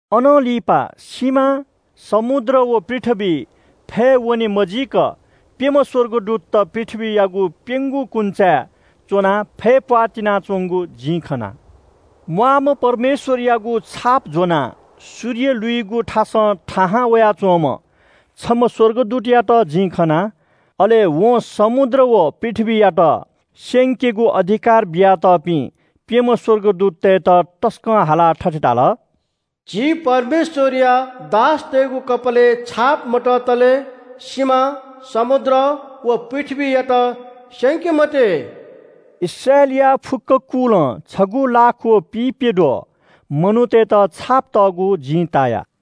अनं लिपा सिमा, समुद्र व पृथ्‍वीइ फय् वने मजीक प्‍यम्‍ह स्‍वर्गदूतत पृथ्‍वीयागु प्‍यंगू कुन्‍चाय् च्‍वनाः फय् प्‍वाः तिनाच्‍वंगु जिं खना। म्‍वाःम्‍ह परमेश्‍वरयागु छाप ज्‍वनाः सूर्य लुइगु थासं थाहां वयाच्‍वंम्‍ह छम्‍ह स्‍वर्गदूतयात जिं खना। अले वं समुद्र व पृथ्‍वीयात स्‍यंकेगु अधिकार बियातःपिं प्‍यम्‍ह स्‍वर्गदूततय्‌त तसकं हालाः थथे धाल। “झी परमेश्‍वरया दासतय्‌गु कपालय् छाप मततले सिमा, समुद्र, व पृथ्‍वीयात स्‍यंके मते।” इस्राएलया फुक्‍क कुलं छगू लाख व पिइप्‍यद्वः मनूतय्‌त छाप तःगु जिं ताया।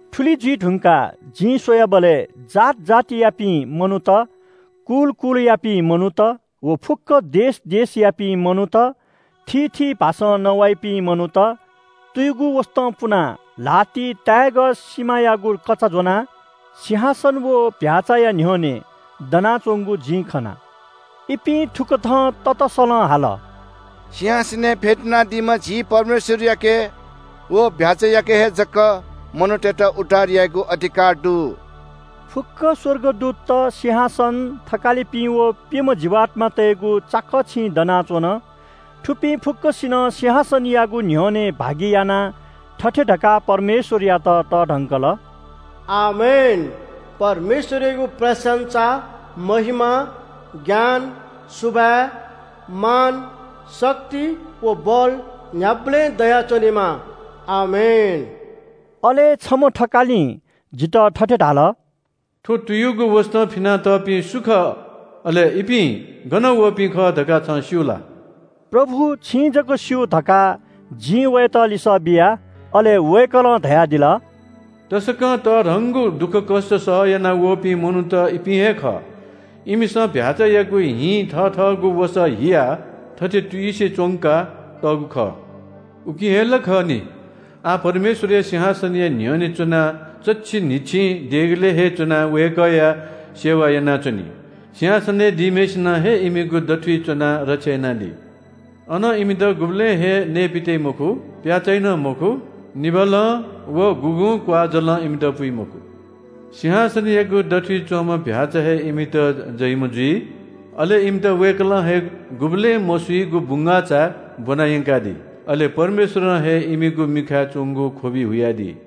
थुलि जुइ धुंकाः जिं स्‍वयाबलय् जात जातियापिं मनूत, कुल कुलयापिं मनूत व फुक्‍क देश देशयापिं मनूत, थीथी भाषां नवाइपिं मनूत तुयुगु वसतं पुनाः ल्‍हातिइ ताय्‌गः सिमायागु कचा ज्‍वनाः सिंहासन व चीधिकःम्‍ह भ्‍याःचाया न्‍ह्यःने दनाच्‍वंगु जिं खना। इपिं थुकथं ततःसलं हाल – “सिंहासनय् फ्‍यतुनादीम्‍ह झी परमेश्‍वरयाके व चीधिकःम्‍ह भ्‍याःचायाके हे जक मनूतय्‌त उद्धार यायेगु अधिकार दु।” फुक्‍क स्‍वर्गदूतत सिंहासन, थकालिपिं व प्‍यम्‍ह जीवात्‍मातय्‌गु चाकःछिं दनाच्‍वन। थुपिं फुक्‍कसिनं सिंहासनयागु न्‍ह्यःने भागियानाः थथे धकाः परमेश्‍वरयात तःधंकल। “आमेन! परमेश्‍वरयागु प्रशंसा, महिमा, ज्ञान, सुभाय्, मान, शक्ति व बल न्‍ह्याबलें दयाच्‍वनेमा। आमेन!” अले छम्‍ह थकालिं जितः थथे धाल – “थ्‍व तुयुगु वसतं फिनातःपिं सु खः, अले इपिं गनं वःपिं खः धकाः छं स्‍यू ला?” “प्रभु, छिं जक स्‍यू” धकाः जिं वयात लिसः बिया। अले वय्‌कलं धयादिल – “तसकं तःधंगु दुःखकष्‍ट सहयाना वःपिं मनूत इपिं हे खः। इमिसं चीधिकःम्‍ह भ्‍याःचायागु हिं थथःगु वसः हियाः थथे तुयुसे च्‍वंका तःगु खः। “उकिं हे ला खः नि, आः परमेश्‍वरया सिंहासनया न्‍ह्यःने च्‍वनाः चच्‍छि न्‍हिच्‍छिं देगलय् हे च्‍वनाः वय्‌कःया सेवा यानाच्‍वनी। सिंहासनय् दीम्‍हय्‌सिनं हे इमिगु दथुइ च्‍वनाः रक्षा यानादी। अन इमित गुबलें हे नयेपित्‍याइ मखु, प्‍याः चाइ नं मखु। निभालं व गुगुं क्‍वाःजलं इमित पुइ मखु। सिंहासनयागु दथुइ च्‍वंम्‍ह चीधिकःम्‍ह भ्‍याःचा हे इमित ज्वइम्‍ह जुइ। अले इमित वय्‌कलं हे गुबलें मसुइगु बुंगाःचाय् ब्‍वना यंकादी। अले परमेश्‍वरं हे इमिगु मिखाय् च्‍वंगु ख्‍वबि हुयादी।”